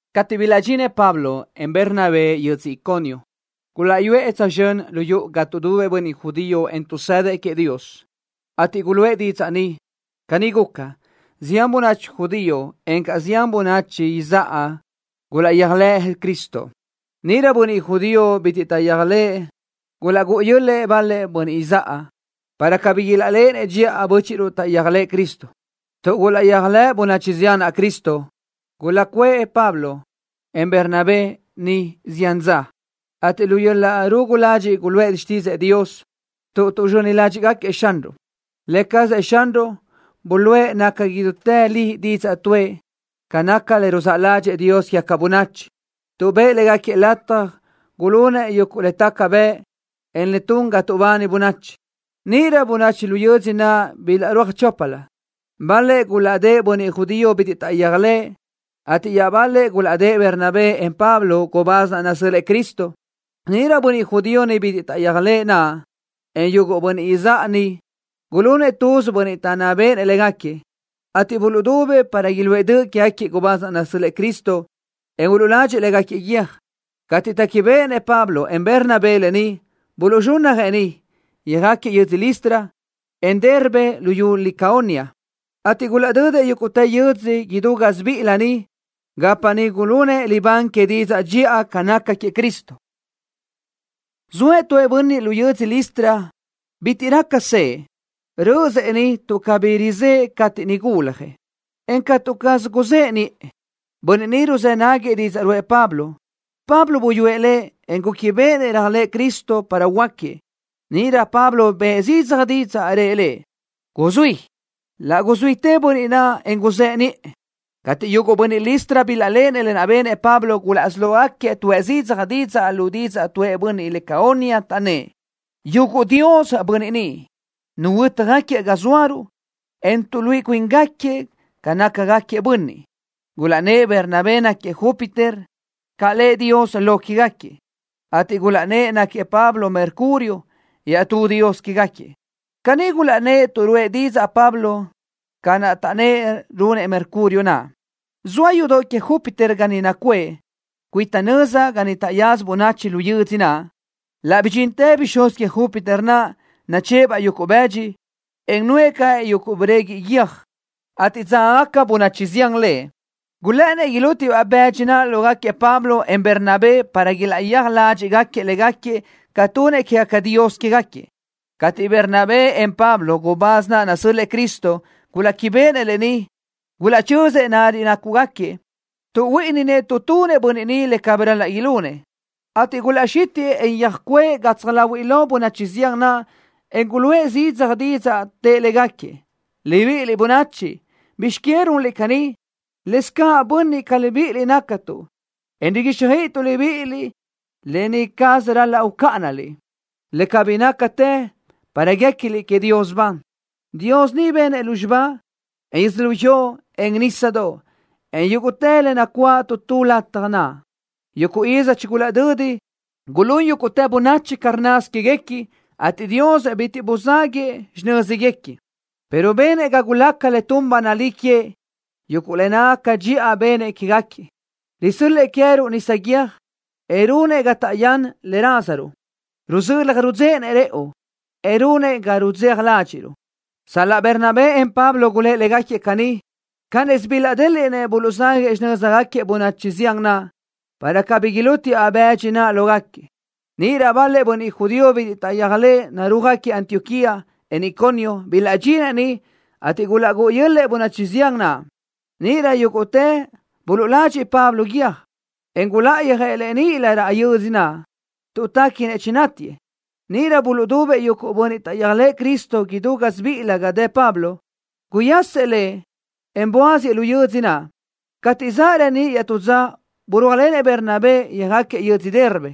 Cateʼ bilaʼdxinëʼ Pablo, en Bernabé yödzö Iconio, gulaʼyuʼë tsözxö́n lu yuʼu ga tuʼdubëʼ bönniʼ judío, en tuʼsëdëʼ queëʼ Dios, ateʼ guluʼë didzaʼ niʼ. Caní guca, zián bönachi judío, encaʼ zián bönachi izáʼa gulaʼyéajlëʼ Cristo. Níʼirö bönniʼ judío bitiʼ taʼyéajlëʼë gulaʼgúʼu yö́l-lëʼë bal-lëʼ bönniʼ izáʼa, para cabí ilaʼléʼenëʼ dxiʼa bö́chiʼruʼ taʼyéajlëʼë Cristo. Tuʼ gulaʼyéajlëʼ bönachi zián naʼ Cristo, gulaʼcuʼë Pablo, en Bernabé niʼ zián dza, ateʼ lu yöl-laʼ rugu ladxiʼ guluʼë xtídzëʼë Dios, tuʼ tuʼzxöni ládxiʼgaquiëʼ Xanruʼ. Lë cazëʼ Xanruʼ buluʼe naca idútë li didzaʼ tuʼë ca naca le ruzáʼ ládxëʼë Dios quégaca bönachi, tuʼ bëʼë légaquiëʼ lataj gulunëʼ yuguʼ le taca bëʼ, en le tun ga tuʼbani bönachi. Níʼirö bönachi lu yödzö naʼ bilaʼrúaj choplö. Bal-lëʼ gulaʼdë́ʼë bönniʼ judío bitiʼ taʼyéajlëʼë, ateʼ iaʼbal-lëʼ gulaʼdë́ʼë Bernabé, en Pablo, gubáz naʼ nasö́l-lëʼë Cristo. Níʼirö bönniʼ judío bitiʼ taʼyéajlëʼë naʼ, en yuguʼ bönniʼ izáʼa niʼ gulunëʼ tuz bönniʼ taʼnná béʼenëʼ légaquiëʼ, ateʼ buluʼdubëʼ para iluʼë döʼ quégaquiëʼ gubáz naʼ nasö́l-lëʼë Cristo, en uluʼladxëʼ légaquiëʼ guiö́j. Cateʼ téquibeʼenëʼ Pablo, en Bernabé lë ni, buluʼzxúnnajëʼ niʼ, yöjáquiëʼ yödzö Listra, en Derbe luyú Licaonia, ateʼ gulaʼdödëʼ yúguʼtë yö́dzödoʼ idú gásibiʼilö niʼ, gapa niʼ gulunëʼ libán que didzaʼ dxiʼa ca naca queëʼ Cristo. Zoëʼ tu bönniʼ lu yödzö Listra bitiʼ raca sëʼë. Rö́ʼösëʼ niʼ tuʼ cabí rizë́ʼë cateʼ niʼ guljëʼ, en catu caz guzëʼe niʼë. Bönniʼ ni ruzë́ náguiëʼ didzaʼ ruʼë Pablo. Pablo buyúëʼ lëʼ, en gúquibeʼenëʼ réajlëʼë Cristo para huöáquiëʼ. Níʼirö Pablo bëʼë zidzaj didzaʼ, en rëʼ lëʼ: —Guzuí. Laʼ guxítiʼtëʼ bönniʼ naʼ, en guzëʼe niʼë. Cateʼ yuguʼ bönniʼ Listra bilaʼléʼenëʼ lë naʼ benëʼ Pablo, gulaʼsí lógaquiëʼ tuʼë zidzaj didzaʼ lu didzaʼ tuʼë bönniʼ Licaonia naʼ, taʼnnë́ʼ: —¡Yuguʼ dios bönniʼ ni! ¡Nuhuö́tjagaquiëʼ ga zóaruʼ, en tuʼluíʼi cuíngaquiëʼ ca nácagaquiëʼ bönniʼ! Gulaʼnnë́ʼ Bernabé naʼ náquiëʼ Júpiter, ca lëʼ dios lo quégaquiëʼ, ateʼ gulaʼnnë́ʼ náquiëʼ Pablo Mercurio, iaʼtú dios quégaquiëʼ. Caní gulaʼnnë́ʼ tuʼ ruʼë didzaʼ Pablo ca naʼ taʼnnë́ʼ runëʼ Mercurio naʼ. Zoa yudoʼ que Júpiter ga niʼ nacuʼë, cuita nöza ga niʼ taʼyaza bönachi lu yödzö naʼ. Laʼ bidxintëʼ bixúz que Júpiter naʼ, nachë́ʼë-baʼ yuguʼ bëdxi, en nuʼë caʼ yuguʼ breguiʼ yöj, ateʼ dzágagaca bönachi zián lëʼ. Gulë́ʼënnëʼ ilútiëʼ-baʼ bëdxi naʼ lógaquiëʼ Pablo, en Bernabé para ilaʼyéaj ládxiʼgaquiëʼ légaquiëʼ ca tunëʼ quégaca dios quégaquiëʼ. Cateʼ Bernabé, en Pablo, gubáz naʼ nasö́l-lëʼë Cristo, guléquibeʼenëʼ lë ni, gulaʼchözëʼ lariʼ nácugaquiëʼ. Tuʼhuíʼininëʼ tuʼ tunëʼ bönniʼ ni le cabí ral-laʼ ilunëʼ, ateʼ gulaʼxítiʼë, en yöjcuʼë gatsaj láhuiʼlö bönachi zián naʼ, en guluʼë zidzaj didzaʼ, tëʼ légaquiëʼ: —¡Libíʼiliʼ bönachi! ¿Bizx que runliʼ caní? Lëscaʼ bönniʼ ca libíʼiliʼ nácatuʼ, en riguíxjöiʼituʼ libíʼiliʼ lë ni caz ral-laʼ ucáʼanaliʼ, le cabí nácatë, para guéquiliʼ queëʼ Dios ban. Dios ni benëʼ lúzxiba, en yödzölió, en nísadoʼ, en yúguʼtë le nacuáʼ tu tu lataj naʼ. Yuguʼ iz chigulaʼdödi, gulún yúguʼtë bönachi ca rnnasö que queëguequi, ateʼ Dios bitiʼ buzáguëʼë xinö́zguequi, pero benëʼ ga gulaca le tun ba nalí queëʼ, yuguʼ le nácagaca dxiʼa benëʼ quégaquiëʼ. Risö́l-lëʼë queë́ruʼ nisa guiö́j, en runëʼ ga taʼyán le rázaruʼ. Ruzölaj rudzéʼenëʼ rëʼu, en runëʼ ga rudzeja ládxiʼruʼ. Sal-laʼ Bernabé, en Pablo gulë́ʼ légaquiëʼ caní, cánnisö bilaʼdéliʼnëʼ buluʼzáguëʼë xinö́zguequi bönachi zián naʼ, para cabí ilútiëʼ-baʼ bëdxi naʼ lógaquiëʼ. Níʼirö bal-lëʼ bönniʼ judío bitiʼ taʼyéajlëʼë, narúajgaquiëʼ Antioquía, en Iconio, bilaʼdxinëʼ niʼ, ateʼ gulaʼgúʼu yö́l-lëʼë bönachi zián naʼ. Níʼirö yúguʼtëʼ buluʼladxëʼ Pablo guiö́j, en guláʼayöjëʼ lëʼ níʼilö raʼ yödzö naʼ, tuʼ téquinëʼ chinátiëʼ. Níʼirö buluʼdubëʼ yuguʼ bönniʼ taʼyéajlëʼë Cristo idú gásibiʼilö ga dëʼ Pablo. Guyasëʼ lëʼ, en buáziëʼ lu yödzö naʼ. Cateʼ zaʼ reníʼ iaʼtú dza, burúajlenëʼ Bernabé, yöjáquiëʼ yödzö Derbe.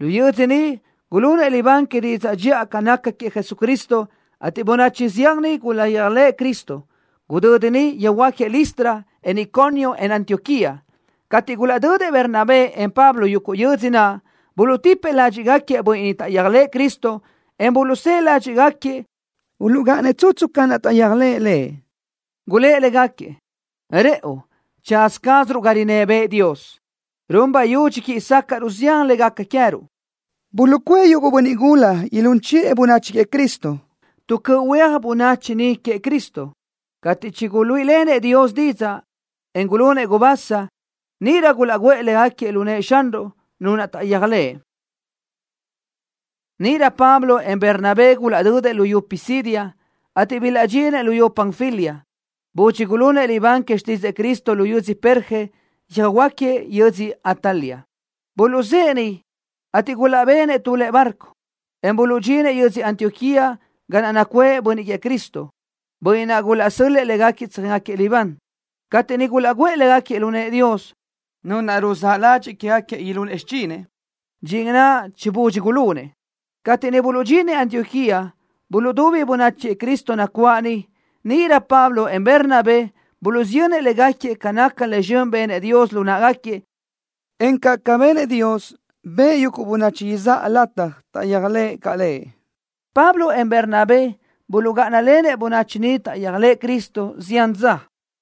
Lu yödzö niʼ gulunëʼ libán que didzaʼ dxiʼa ca naca queëʼ Jesucristo, ateʼ bönachi zián niʼ gulaʼyéajlëʼ Cristo. Gudödi niʼ yöjhuö́jgaquiëʼ Listra, en Iconio, en Antioquía. Cateʼ gulaʼdödëʼ Bernabé, en Pablo yuguʼ yödzö naʼ, buluʼtipëʼ ládxiʼgaquiëʼ bönniʼ niʼ taʼyéajlëʼë Cristo, en buluʼsë́ʼë ládxiʼgaquiëʼ uluʼgáʼanëʼ tsutsu ca naʼ taʼyéajlëʼë Lëʼ. Gulë́ʼ légaquiëʼ: —Rëʼu tsaza cázaruʼ ga rinná bëʼë Dios, run bayudxi quíʼi sácaʼruʼ zián le gaca queë́ruʼ. Buluʼcuʼë yuguʼ bönniʼ gula ilún chiʼë bönachi queëʼ Cristo tu cöʼ huéaj bönachi niʼ queëʼ Cristo. Cateʼ chiguluíʼilenëʼ Dios didzaʼ, en gulunëʼ gubasa, níʼirö gulaʼguʼë légaquiëʼ lu nëʼë Xanruʼ, Nu naʼ taʼyéajlëʼë. Níʼirö Pablo, en Bernabé gulaʼdödëʼ luyú Pisidia, ateʼ bilaʼdxinëʼ luyú Panfilia. Budxi gulunëʼ libán que xtídzëʼë Cristo lu yödzö Perge, yöjáquiëʼ yödzö Atalia. Buluʼzë́ʼë niʼ, ateʼ gulaʼbenëʼ tu lëʼe barco, en buluʼdxinëʼ yödzö Antioquía, ga naʼ nacuʼë bönniʼ queëʼ Cristo, bönniʼ naʼ gulaʼsö́l-lëʼë légaquiëʼ tsöjéngaquiëʼ libán, cateʼ niʼ gulaʼguʼë légaquiëʼ lu nëʼë Dios, Nu naʼ ruzáʼ ladxiʼ quégaquiëʼ ilunëʼ xichinëʼ, dxin naʼ chibudxi gulunëʼ. Cateʼ niʼ buluʼdxinëʼ Antioquía, buluʼdubi bönachi queëʼ Cristo nacuáʼ niʼ. Níʼirö Pablo, en Bernabé buluʼsiyönnëʼ légaquiëʼ ca nácagaca le zxön benëʼ Dios lu náʼagaquiëʼ, encaʼ ca benëʼ Dios, bëʼë yuguʼ bönachi izáʼa lataj taʼyéajlëʼ caʼ Lëʼ. Pablo, en Bernabé buluʼgáʼanalenëʼ bönachi niʼ taʼyéajlëʼ Cristo zián dza.